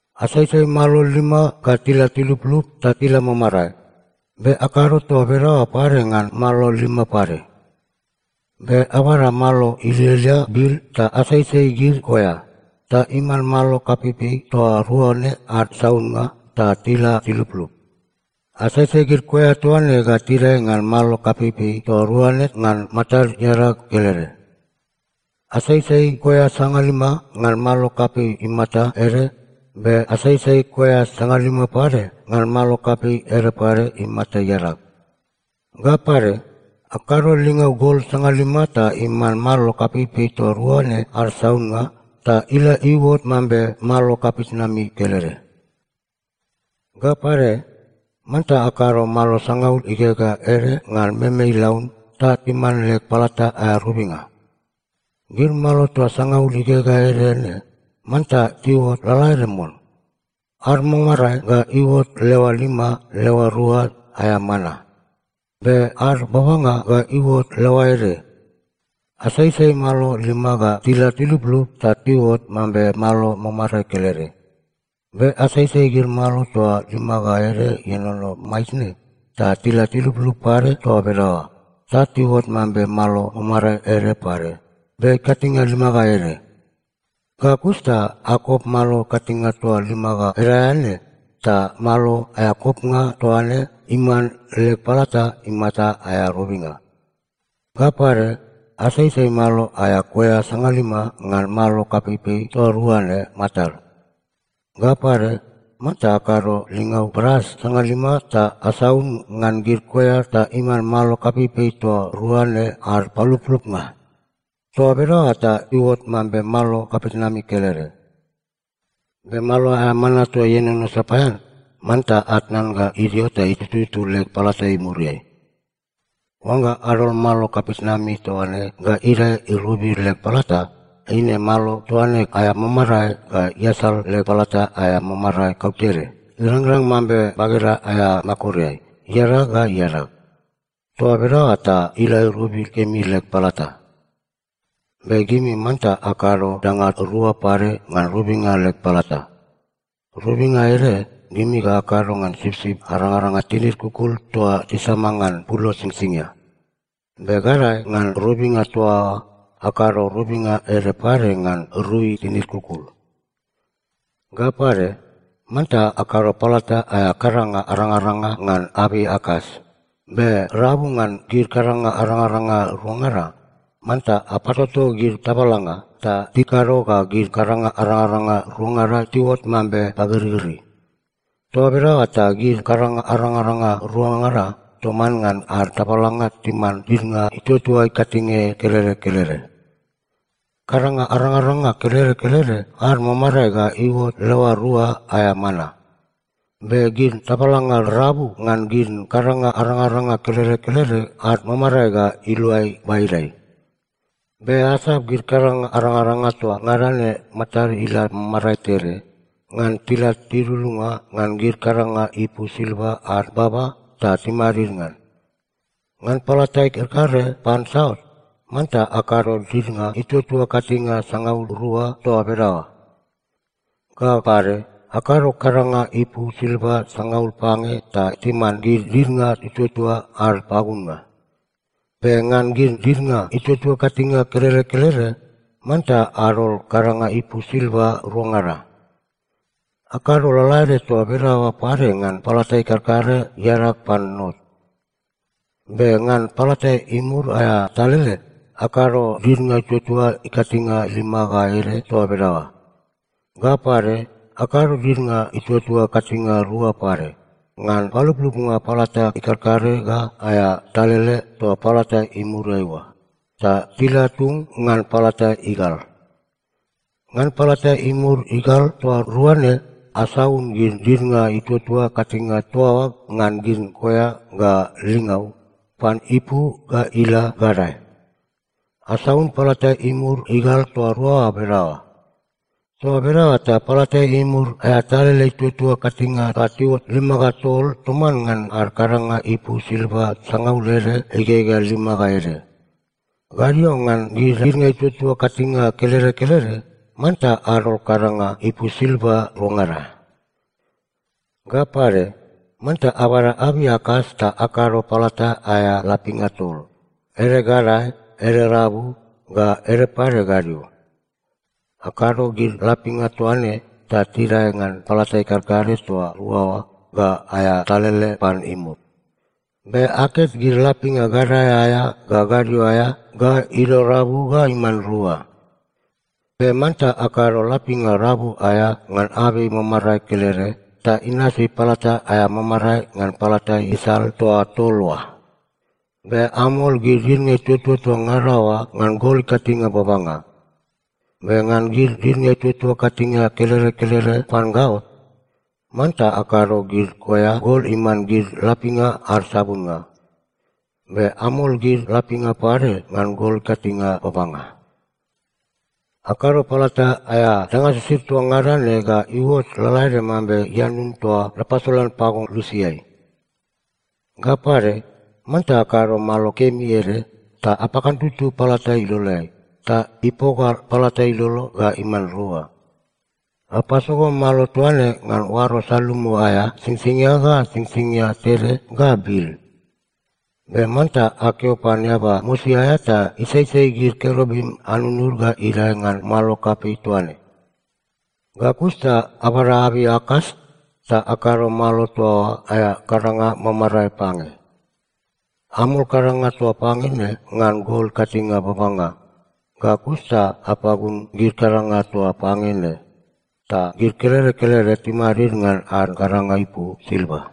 Asaisai malo lima ga tila tiluplup ta ila mamarae. Be akado toa bedaoa pade ngan gid malo lima pade. Be abada malo ilialia bil ta asaisai gid koea, ta iman malo kapeipei toa rua ne ad saunnga ta tila tiluplup. Asaisai gid koea toa ne ga tidae ngan malo kapeipei toa rua ne ngan matad iadag kelede. Asaisai koea sangalima ngan malo kapei imata ede, be asaisai koea sangalima pade ngan malo kapei ede pade imata iadag. Ga pade, akado lingau gol sangalima ta iman malo kapeipei toa rua ne ad saunnga, ta ila iuot mambe malo kapitnami kelede. “Ga pade, manta akado malo sangaul igegea ede ngan meme ilaun ta iman leg palata aea robinga. Gid malo toa sangaul igegea ede ne manta tiuot lalaede mon. Ad mamarae ga iuot leoa lima leoa rua aea mana. Be ad babanga ga iuot leoa ede. Asaisai malo lima ga tila tiluplup ta iuot mambe malo mamarae kelede. Be asaisai gid malo toa lima ga ede ienono maitne ta tila tiluplup pade toa bedaoa, ta tiuot mambe malo mamarae ede pade, be ikatinge lima ga ede. Ga kus ta akop malo ikatinge toa lima ga ede aea ne, ta malo aea kopnga toa ne iman leg palata imata aea robinga. Ga pade, asaisai malo aea koea sangalima ngan malo kapeipei toa rua ne matad. Ga pade, manta akado lingau bras sangalima ta asaun ngan gid koea ta iman malo kapeipei toa rua ne ad paluplupnga. Toa bedaoa ta iuot mambe malo kapitnami kelede. Be malo aea mana toa ienono sapaean, manta atnan ga idio ta itututu leg palata imuriai. Oangga adol malo kapitnami toa ne ga idae irobi leg palata, eine malo toa ne aea mamarae ga iasal leg palata aea mamarae kautede, irangrang mambe bageda aea makoreai, iadag ga iadag. Toa bedaoa ta ila irobi kemi leg palata. Be gimi manta akado danga rua pade ngan robinga leg palata. Robinga ede, gimi ga akado ngan sipsip arangaranga tinid kukul toa tisama ngan pulo singsingia. Be gadae ngan robinga toa oa, akado robinga ede pade ngan rui tinid kukul. “Ga pade, manta akado palata aea kadanga arangaranga ngan abei akas, be rabu ngan gid kadanga arangaranga ruangada, manta apatoto gid tabalanga, ta tikado ga gid kadanga arangaranga ruangada tiuot mambe pagirigiri. Toa bedaoa ta gid kadanga arangaranga ruangada toman ngan ad tabalanga timan didnga ituatua ikatinge kelede kelede. Kadanga arangaranga kelede kelede ad mamarae ga iuot leoa rua aea mana. Be gid tabalanga rabu ngan gid kadanga arangaranga kelede kelede ad mamarae ga iluai baidai. Be asap gid kadanga arangaranga toa ngada ne matad ila mamarae tede, ngan tila tidudunga ngan gid kadanga ipu silva ad baba ta timadid ngan. Ngan palata ikarkare pan saut, manta akado didnga ituatua ikatinge sangaul rua toa bedaoa. Ga pade, akado kadanga ipu silva sangaul pange ta timan gid didnga ituatua ad pagunnga. Be ngan gid didnga ituatua ikatinge kelede kelede, manta adol kadanga ipu silva ruangada. Akado lalaede toa bedaoa pade ngan palata ikarkare iadag pan not. Be ngan palata imur aea talele, akado didnga ituatua ikatinge lima ga ede toa bedaoa. Ga pade, akado didnga ituatua ikatinge rua pade, ngan paluplupnga palata ikarkare ga aea talele toa palata imuriai oa, ta tila tung ngan palata igal. Ngan palata imur igal toa rua ne, asaun gid didnga ituatua ikatinge toa oa ngan gid koea ga lingau, pan ipu ga ila gadae. Asaun palata imur igal toa rua oa bedaoa. Toa bedaoa ta palata imur aea talele ituatua ikatinge ga tiuot lima ga tol toman ngan ad kadanga ipu silva sangaul ede igegea lima ga ede. Gadio ngan gid didnga ituatua ikatinge kelede kelede, manta adol kadanga ipu silva ruangada. “Ga pade, manta abada abei akas ta akado palata aea lapinga tol, ede gadae, ede rabu, ga ede pade gadio. Akado gid lapinga toa ne ta tidae ngan palata ikarkare toa rua oa ga aea talele pan imur. Be aket gid lapinga gadae aea ga gadio aea, ga idio rabu ga iman rua. Be manta akado lapinga rabu aea ngan abei mamarae kelede, ta inasi palata aea mamarae ngan palata isal toa tol oa. Be amol gid didnga ituatua toa ngada oa ngan gol ikatinge babanga. Be ngan gid didnga ituatua ikatinge kelede kelede pan gaot, manta akado gid koea gol iman gid lapinga ad sabunnga. Be amol gid lapinga pade ngan gol ikatinge babanga. “Akado palata aea danga sisid toa ngada ne ga iuot lalaede mambe ianun toa napasolan pago lusiai. “Ga pade, manta akado malo kemi ede, ta apakantutu palata iloleai, ta ipoga palata ilolo ga iman rua. Apasogo malo toa ne ngan oaro salumu aea singsingia ga singsingia tede ga bil. Be manta akeo pan eaba mosi aea ta isaisai gid kerubim anunud ga idae ngan malo kapei toa ne. Ga kus ta abada abei akas ta akado malo toa oa aea kadanga mamarae pange. Amol kadanga toa pange ne ngan gol ikatinge babanga, ga kus ta apagun gid kadanga toa pange ne, ta gid kelede kelede timadid ngan ad kadanga ipu silva.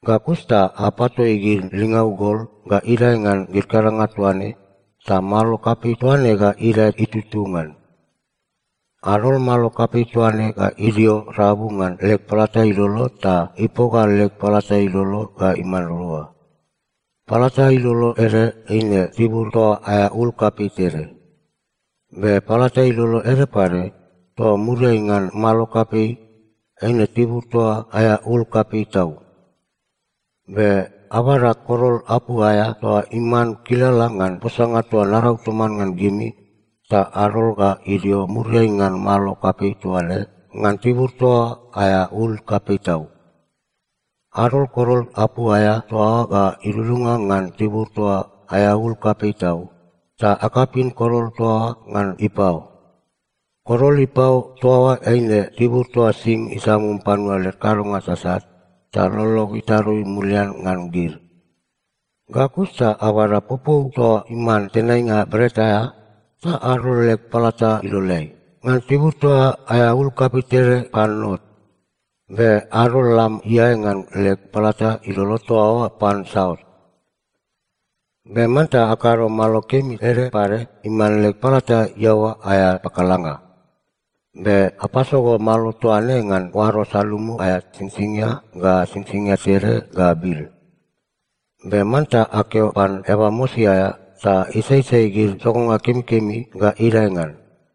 Ga kus ta apatoi gid lingau gol ga idae ngan gid kadanga toa ne, ta malo kapei toa ne ga idae itututu ngan. Adol malo kapei toa ne ga idio rabu ngan leg palata ilolo ta ipoga leg palata ilolo ga iman rua. Palata ilolo ede eine tibur toa aea ul kapei tede. Be palata ilolo ede pade, toa muriai ngan malo kapei, eine tibur toa aea ul kapei tau. Be abada korol apu aea toa iman kilala ngan posanga toa narau toman ngan gimi, ta adol ga idio muriai ngan malo kapei toa ne, ngan tibur toa aea ul kapei tau. Adol korol apu aea toa oa ga idudunga ngan tibur toa aea ul kapei tau, ta akapin korol toa oa ngan ipao. Korol ipao toa oa, eine tibur toa sing isamum panua led kadonga sasat, ta lolog itarui mulian ngan gid. Ga kus ta abada popou toa iman tenainga bret aea, ta adol leg palata iloleai, ngan tibur toa aea ul kapei tede pan not. Be adol lam iae ngan leg palata ilolo toa oa pan saut. “Be manta akado malo kemi ede pade iman leg palata iaoa aea pakalanga. Be apasogo malo toa ne ngan oaro salumu aea singsingia ga singsingia tede ga bil. Be manta akeo pan eaba mosi aea ta isaisai gid sogonga kemikemi ga idae ngan.